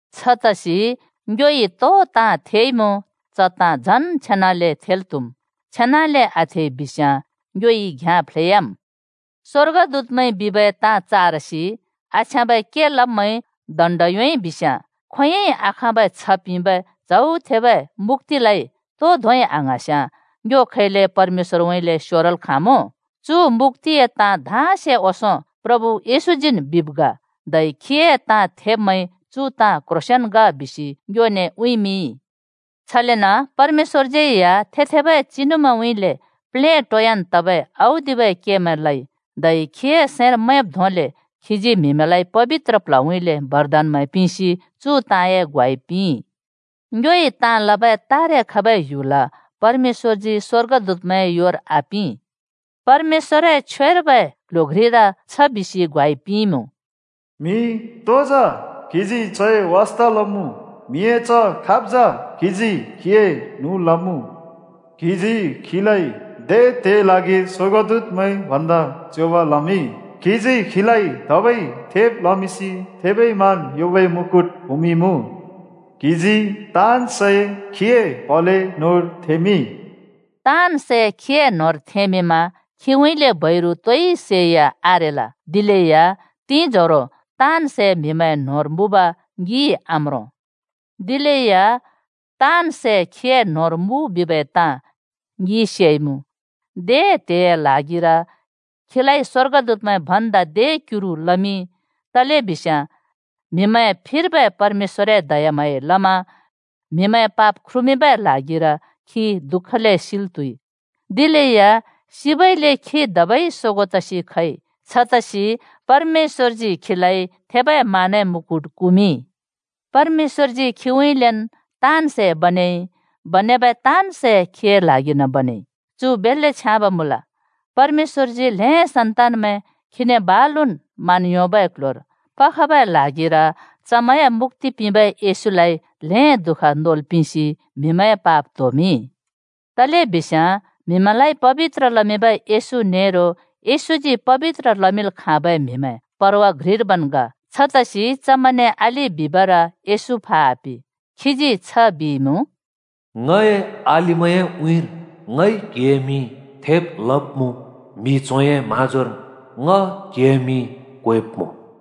छतसि ङ्योइ तो ताँ थेइमुँ च ताँ झन् छेनाले थेल् त्हुम्। छेनाले आथेइ बिस्याँ ङ्योइ घ्‍याँ फ्लेयाम्। स्‍वर्गदूतमैंइ बिबै ताँ चारसि, आछ्याँबै के लब्मैंइ दण्ड योंइ बिस्याँ, खोंयोंइ आखाँबै छ्ह पिंबै च्हौ थेबै मुक्‍तिलाइ तो धोंइ आङ्हाँस्याँ ङ्यो खैले परमेश्‍वरउँइँले स्योरल् खाँमुँ? चु मुक्‍तिए ताँ धाँसे ओंसों प्रभु येशूजीन् बिब् ग, धै खीए ताँ थेब्‍मैंइ चु ताँ क्ह्रोंसेंन ग बिसि ङ्योने उँइँमिंइ। छलेन परमेश्‍वरज्‍यै या थे-थेबै चिनुमैंउँइँले प्लेटोयान् तबै औदिबै केमैं लइ, धै खीए सैंर मैंब् धोंले खीजी म्‍हिमैंलाइ पबित्र प्ल्हउँइँले बरदानमैं पिंसि चु ताँए ग्वाइ पिंइ। ङ्योइ ताँ लबै तारे खबै ह्‍युल परमेश्‍वरजी स्‍वर्गदूतमैंए योर आपिं। परमेश्‍वरए छ्वेर्बै क्ल्ह्‍यो घ्रिर छ बिसि ग्वाइ पिंइमुँ: “म्‍हि तो जा, क्‍हिजी चए वास्ता लमुँ? म्‍हिए च्ह खाब् जा, क्हिजी खीए न्हुँ लमुँ? क्‍हिजी खीलाइ दे त्हेए ल्हागिर स्‍वर्गदूतमैं भन्दा च्योंब लमिंइ। क्हिजी खीलाइ धबै थेब लमिंसि थेबै मान योंबै मुकुट कुमिंइमुँ। क्हिजी ताँन् सै खीए प्हले न्होंर थेंमिंइ।” ताँन् सै खीए न्होंर थेंमिंमा खीउँइँले बैरु तोइ सैया आरेल। दिलेया तिंजोरो ताँन् सै म्हिमैंए न्होंर मुँब ङिइ आम्रों। दिलेया ताँन् सै खीए न्होंर मुँ बिबै ताँ ङिइ सेइमुँ। दे त्हेए ल्हागिर खीलाइ स्वर्गदूतमैं भन्दा दे क्युरु लमिंइ, तलेबिस्याँ म्हिमैंए फिर्बै परमेश्‍वरए दयाम्हाँयाइ लमा म्हिमैंए पाप ख्रुमिंबै ल्हागिर खी दु:खले सिल् त्हुइ। दिलेया सिबइले खी धबै सोगों तसि खइ। छतसि परमेश्‍वरजी खीलाइ थेबै मानए मुकुट कुमिंइ। परमेश्‍वरजी खीउँइँलेन् ताँन् सै बनेइ बनेबै ताँन् सै खीए ल्हागिर्न बनेइ। चु बेल्‍ले छ्याँब मुँल। परमेश्‍वरजी ल्‍हें सन्तानमैं खीने बालुन् मान योंबै क्ल्ह्‍योर पखबै ल्हागिर चमैंए मुक्‍ति पिंबै येशूलाइ ल्‍हें दुःख नोल् पिंसि म्हिमैंए पाप त्होमिंइ। तलेबिस्याँ म्हिमैंलाइ पबित्र लमिंबै येशू नेरो येशूजी पबित्र लमिंल् खाँबै म्हिमैं परवा घ्रिर्बैन् ग। छतसि चमैंने अलि बिबर येशू फा आपे। खीजी छ बिइमुँ, “ङए अलिमैंए उँइँर ङइ क्‍हिए मिं थेब् लब्‍मुँ, म्‍हि च्होंए म्‍हाँजोर ङ क्‍हिए मिं क्वेब्‍मुँ।”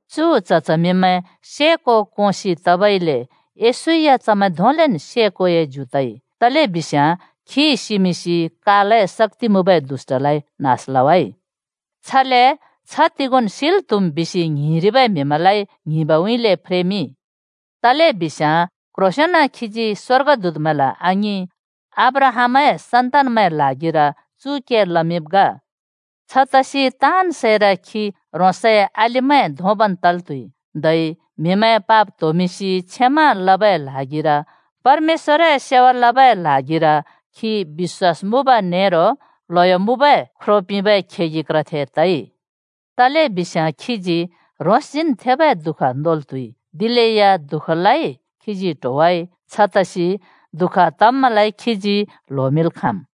चु च्ह च्हमिंमैं से को कोंसि तबइले येशू या चमैं धोंलेन् से कोए ज्यु तइ। तलेबिस्याँ खी सिमिंसि कालए शक्‍ति मुँबै दुष्‍टलाइ (दियाबलस) नास लवाइ। छले छ्ह तिगोंन् सिल् त्‍हुम् बिसि ङ्हिंरिबै म्हिमैंलाइ ङ्हिंबउँइँले फ्रेमिंइ। तलेबिस्याँ क्ह्रोंसेंन खीजी स्‍वर्गदूतमैंला आङिं, अब्राहामए सन्‍तानमैं ल्हागिर चु के लमिंब् ग। छतसि ताँन् सैर खी ह्रोंसए अलिमैं धोंबन् तल् त्हुइ, धै म्‍हिमैंए पाप त्होमिंसि क्षमा लबै ल्हागिर परमेश्‍वरए सेवा लबै ल्हागिर खी बिश्‍वास मुँब नेरो ल्हयो मुँबै ख्रो पिंबै खेगि क्रथे तइ। तलेबिस्याँ खीजी ह्रोंसजीन् थेबै दुःख नोल् त्हुइ दिलेया दुःखलाइ खीजी ट्होवाइ, छतसि दुःख तब्मैंलाइ खीजी ल्होमिंल् खाँम्।